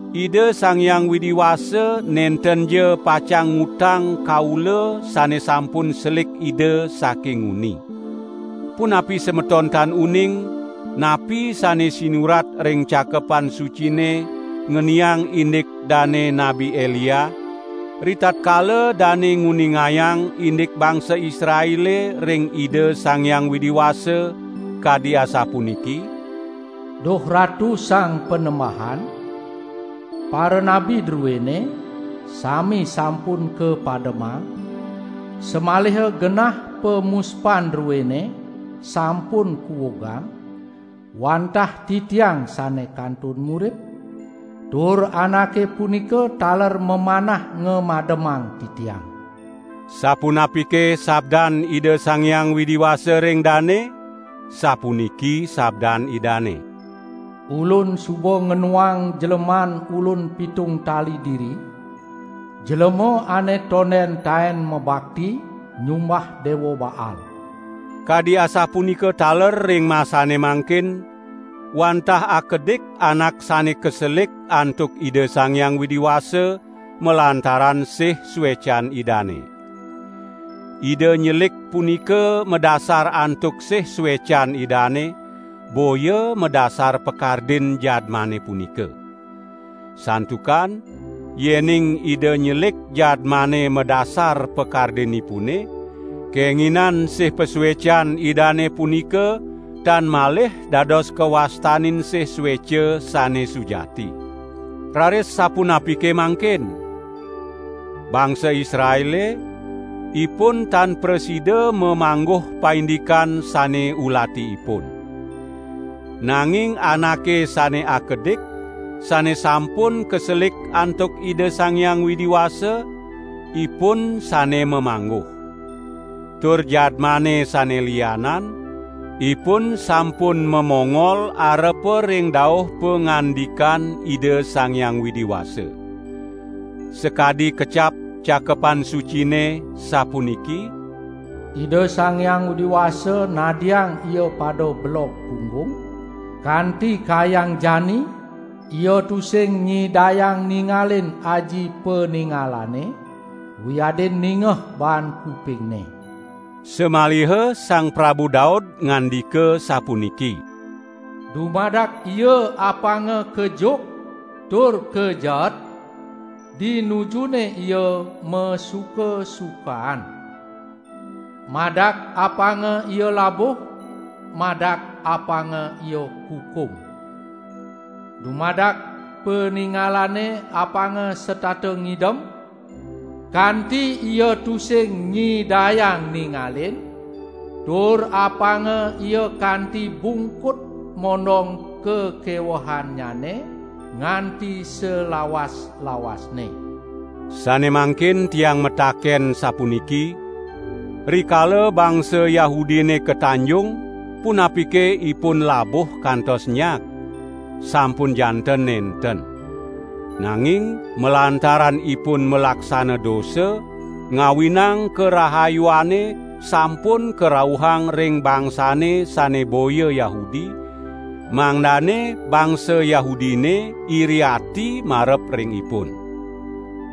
Ida Sang Hyang Widi Wasa nentenja pacang ngutang kaula sane sampun selik Ida saking nguni. Punapi semeton tan uning, napi sane sinurat ring Cakepan Sucine ngeniang indik dane Nabi Elia, ritatkala dane nguningayang indik bangsa Israele ring Ida Sang Hyang Widi Wasa, kadi asapuniki: "Duh Ratu Sang Panembahan, paranabi druene sami sampun kapademang, samaliha genah pamuspan druene sampun kuugang, wantah titiang sane kantun murip, tur anake punika taler mamanah ngamademang titiang." Sapunapike sabdan Ida Sang Hyang Widi Wasa ring dane? Sapuniki sabdan Idane: "Ulun suba ngenuang jleman Ulun pitung tali diri, jlema ane tonden taen mabakti nyumbah Dewa Baal." Kadi asapunika taler ring masane mangkin, wantah akedik anak sane kaselik antuk Ida Sang Hyang Widi Wasa, malantaran sih suecan Idane. Ida nyelik punika madasar antuk sih suecan Idane, boya madasar pakardin jadmane punika. Santukan yening Ida nyelik jadmane madasar pakardinipune, kenginan sih pasuecan Idane punika tan malih dados kawastanin sih sueca sane sujati. Raris sapunapike mangkin? Bangsa Israele, ipun tan prasida mamangguh paindikan sane ulati ipun. Nanging anake sane akedik, sane sampun kaselik antuk Ida Sang Hyang Widi Wasa, ipun sane mamangguh. Tur jadmane sane lianan, ipun sampun mamongol arepa ring dauh pangandikan Ida Sang Hyang Widi Wasa. Sakadi kecap Cakepan Sucine, sapuniki: "Ida Sang Hyang Widi Wasa nadiang ia pada belog punggung; kanti kayang jani ia tusing nyidayang ningalin aji paningalane wiadin ningeh baan kupingne." Samaliha Sang Prabu Daud ngandika sapuniki: "Dumadak ia apanga kejuk tur kajeet di nujune ia masuka-sukaan; madak apanga ia labuh, madak apanga ia kukum. Dumadak paningalane apanga setata ngidem, kanti ia tusing nyidayang ningalin; tur apanga ia kanti bungkut mondong kakewehannyane nganti salawas-lawasne." Sane mangkin tiang mataken sapuniki: "Rikala bangsa Yahudine katanjung punapike ipun labuh kantos nyag? Sampun janten nenten! Nanging malantaran ipun malaksana dosa, ngawinang karahayuane sampun karauhang ring bangsane sane boya Yahudi, mangdane bangsa Yahudine iri ati marep ring ipun.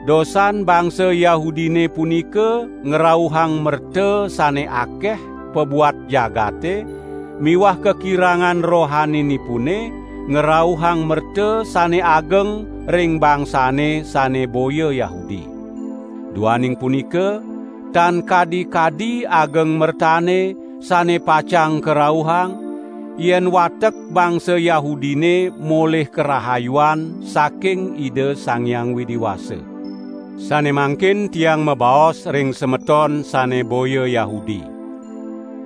Dosan bangsa Yahudine punika ngrauhang merta sane akeh pabuat jagate miwah kakirangan rohaninipune ngrauhang merta sane ageng ring bangsane sane boya Yahudi. Duaning punika, tan kadi-kadi ageng mertane sane pacang karauhang, yen watek bangsa Yahudine molih karahayuan saking Ida Sang Hyang Widi Wasa. Sane mangkin tiang mabaos ring semeton sane boya Yahudi.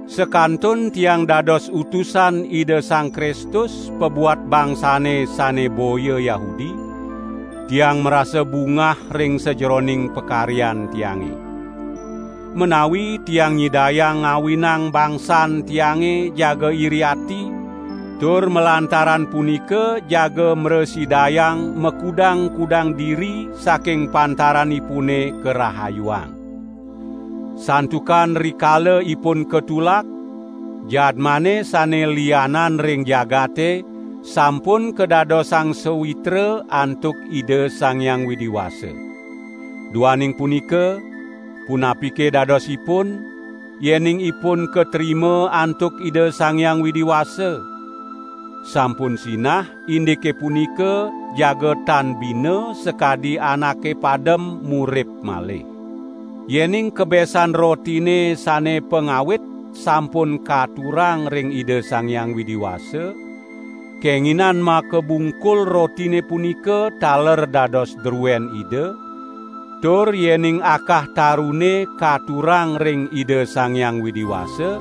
Sakantun tiang dados utusan Ida Sang Kristus pabuat bangsane sane boya Yahudi, tiang marasa bungah ring sajeroning pakaryan tiange. Menawi tiang nyidayang ngawinang bangsan tiange jaga iri ati, tur malantaran punika jaga mrasidayang makudang-kudang diri saking pantaranipune karahayuang. Santukan rikala ipun katulak, jadmane sane lianan ring jagate sampun kadadosang sawitra antuk Ida Sang Hyang Widi Wasa. Duaning punika, punapike dadosipun; yening ipun katrima antuk Ida Sang Hyang Widi Wasa? Sampun sinah indike punika jaga tan bina sakadi anake padem murip malih. Yening kebesan rotine sane pangawit sampun katurang ring Ida Sang Hyang Widi Wasa, kenginan makabungkul rotine punika taler dados druen Ida, tur yening akah tarune katurang ring Ida Sang Hyang Widi Wasa,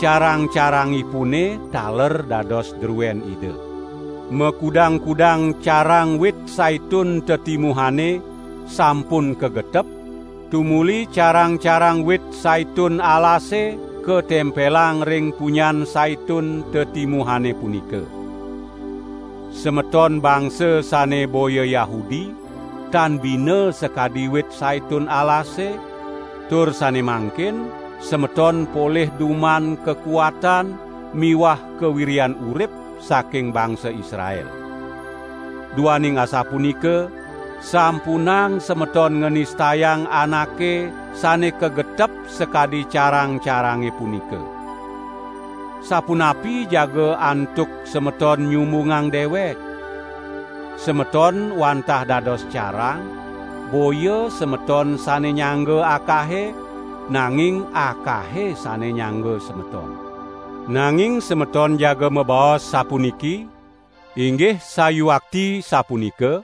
carang-carangipune taler dados druen Ida. Makudang-kudang carang wit saitun tetimuhane sampun kagetep, tumuli carang-carang wit saitun alase katempelang ring punyan saitun tetimuhane punika. Semeton bangsa sane boya Yahudi tan bina sakadi wit saitun alase, tur sane mangkin semeton polih duman kakuatan miwah kawiryan urip saking bangsa Israel. Duaning asapunika, sampunang semeton nganistayang anake sane kagetep sakadi carang-carange punika. Sapunapi jaga antuk semeton nyumbungang dewek? Semeton wantah dados carang; boya semeton sane nyangga akahe, nanging akahe sane nyangga semeton. Nanging semeton jaga mabaos sapuniki: "Inggih sayuakti sapunika;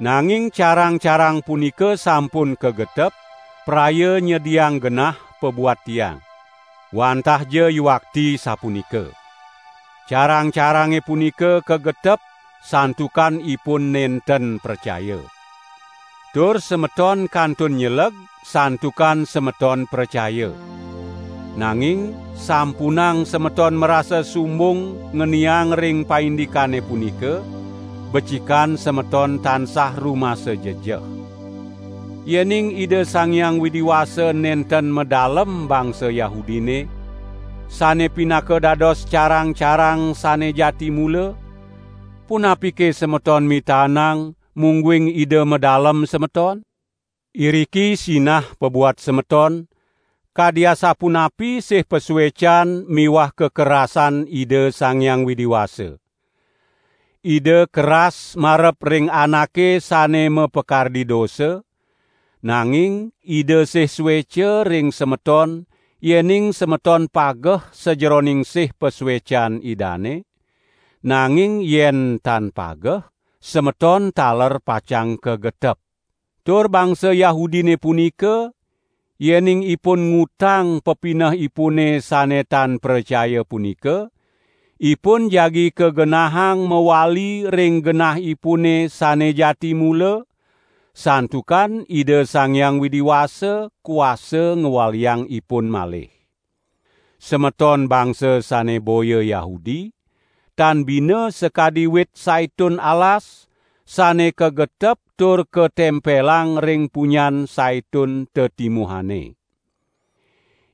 nanging carang-carang punika sampun kagetep, praya nyediang genah pabuat tiang." Wantahja yuakti sapunika. Carang-carange punika kagetep santukan ipun nenten pracaya. Tur semeton kantun nyeleg santukan semeton pracaya. Nanging sampunang semeton marasa sumbung ngeniang ring paindikane punika; becikan semeton tansah rumasa jejeh. Yening Ida Sang Hyang Widi Wasa nenten madalem bangsa Yahudine, sane pinaka dados carang-carang sane jati mula, punapike semeton mitaenang, mungguing Ida madalem semeton? Iriki sinah pabuat semeton, kadi asapunapi sih pasuecan miwah kakerasan Ida Sang Hyang Widi Wasa. Ida keras marep ring anake sane mapakardi dosa, nanging Ida sih sueca ring semeton yening semeton pageh sajeroning sih pasuecan Idane; nanging yen tan pageh, semeton taler pacang kagetep. Tur bangsa Yahudine punika, yening ipun ngutang pepinehipune sane tan pracaya punika, ipun jagi kagenahang mawali ring genahipune sane jati mula, santukan Ida Sang Hyang Widi Wasa kuasa ngwaliang ipun malih. Semeton bangsa sane boya Yahudi, tan bina sakadi wit saitun alas, sane kagetep tur katempelang ring punyan saitun tetimuhane.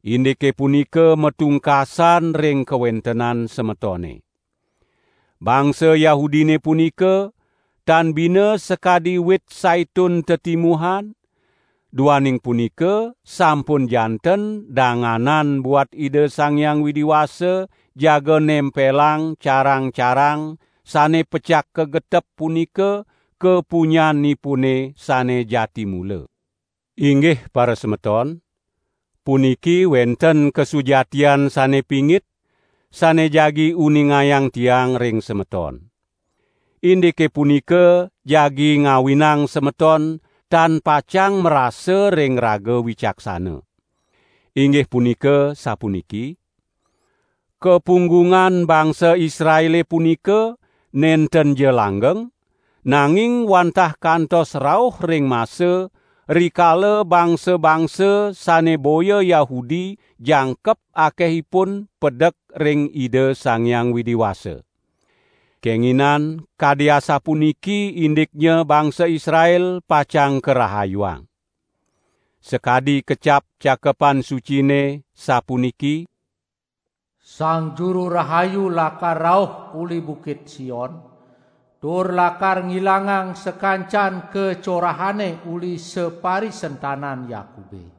Indike punika matungkasan ring kawentenan semetone. Bangsa Yahudine punika, tan bina sakadi wit saitun tetimuhan; duaning punika sampun janten danganan buat Ida Sang Hyang Widi Wasa jaga nempelang carang-carang sane pecak kagetep punika ka punyanipune sane jati mula. Inggih parasemeton! Puniki wenten kasujatian sane pingit, sane jagi uningayang tiang ring semeton. Indike punika jagi ngawinang semeton tan pacang marasa ring raga wicaksana. Inggih punika sapuniki: "Kapunggungan bangsa Israele punika nentenja langgeng, nanging wantah kantos rauh ring masa, rikala bangsa-bangsa sane boya Yahudi jangkep akehipun pedek ring Ida Sang Hyang Widi Wasa. Kenginan kadi asapuniki indiknya bangsa Israel pacang karahayuang. Sakadi kecap Cakepan Sucine sapuniki: "Sang Juru Rahayu lakar rauh uli bukit Sion, tur lakar ngilangang sakancan kacorahane uli saparisentanan Yakube.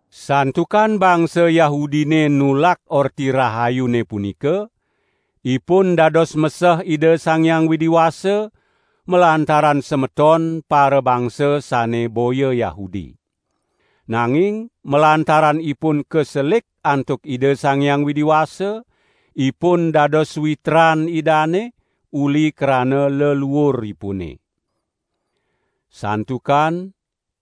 Santukan bangsa Yahudine nulak Orti Rahayune punika, ipun dados meseh Ida Sang Hyang Widi Wasa, malantaran semeton parabangsa sane boya Yahudi. Nanging malantaran ipun kaselik antuk Ida Sang Hyang Widi Wasa, ipun dados sawitran Idane, uli krana leluuripune. Santukan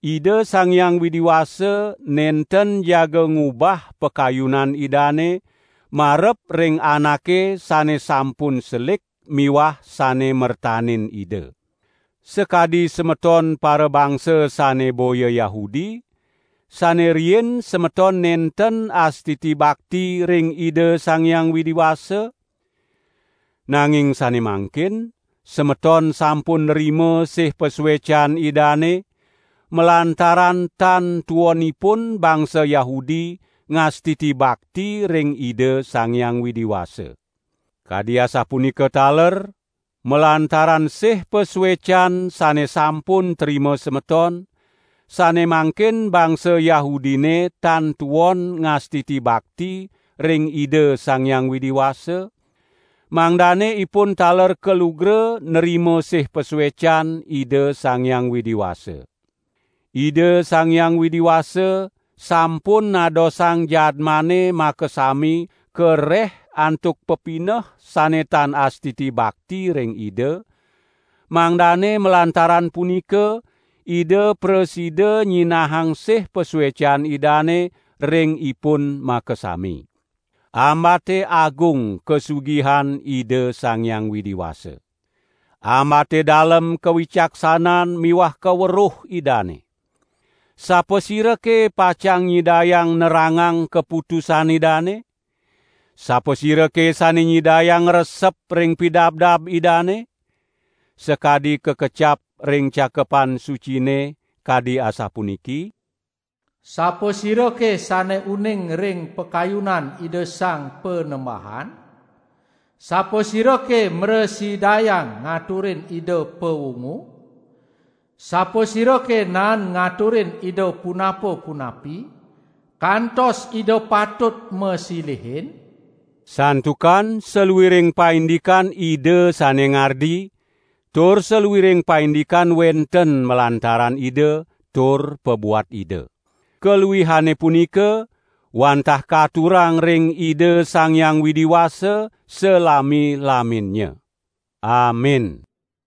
Ida Sang Hyang Widi Wasa nenten jaga ngubah pakayunan Idane marep ring anake sane sampun selik miwah sane mertanin Ida. Sakadi semeton parabangsa sane boya Yahudi, sane riin semeton nenten astiti bakti ring Ida Sang Hyang Widi Wasa; nanging sane mangkin semeton sampun nrima sih pasuecan Idane, malantaran tan tuonipun bangsa Yahudi ngastiti bakti ring Ida Sang Hyang Widi Wasa. Kadi asapunika taler, malantaran sih pasuecan sane sampun trima semeton, sane mangkin bangsa Yahudine tan tuon ngastiti bakti ring Ida Sang Hyang Widi Wasa, mangdane ipun taler kalugra nrima sih pasuecan Ida Sang Hyang Widi Wasa. Ida Sang Hyang Widi Wasa sampun nadosang jadmane makasami kareh antuk pepineh sane tan astiti bakti ring Ida, mangdane malantaran punika, Ida prasida nyinahang sih pasuecan Idane ring ipun makasami. Ambate agung kasugihan Ida Sang Hyang Widi Wasa. Ambate dalem kawicaksanan miwah kaweruh Idane! Sapasirake pacang nyidayang nerangang kaputusan Idane? Sapasirake sane nyidayang ngresep ring pidabdab Idane? Sakadi kakecap ring Cakepan Sucine kadi asapuniki: "Sapasirake sane uning ring pakayunan Ida Sang Panembahan? Sapasirake mrasidayang ngaturin Ida pawungu? Sapasirake naen ngaturin Ida punapa-punapi, kantos Ida patut masilihin?" Santukan saluiring paindikan Ida sane ngardi, tur saluiring paindikan wenten malantaran Ida, tur pabuat Ida. Kaluihane punika, wantah katurang ring Ida Sang Hyang Widi Wasa salami-laminnya. Amin.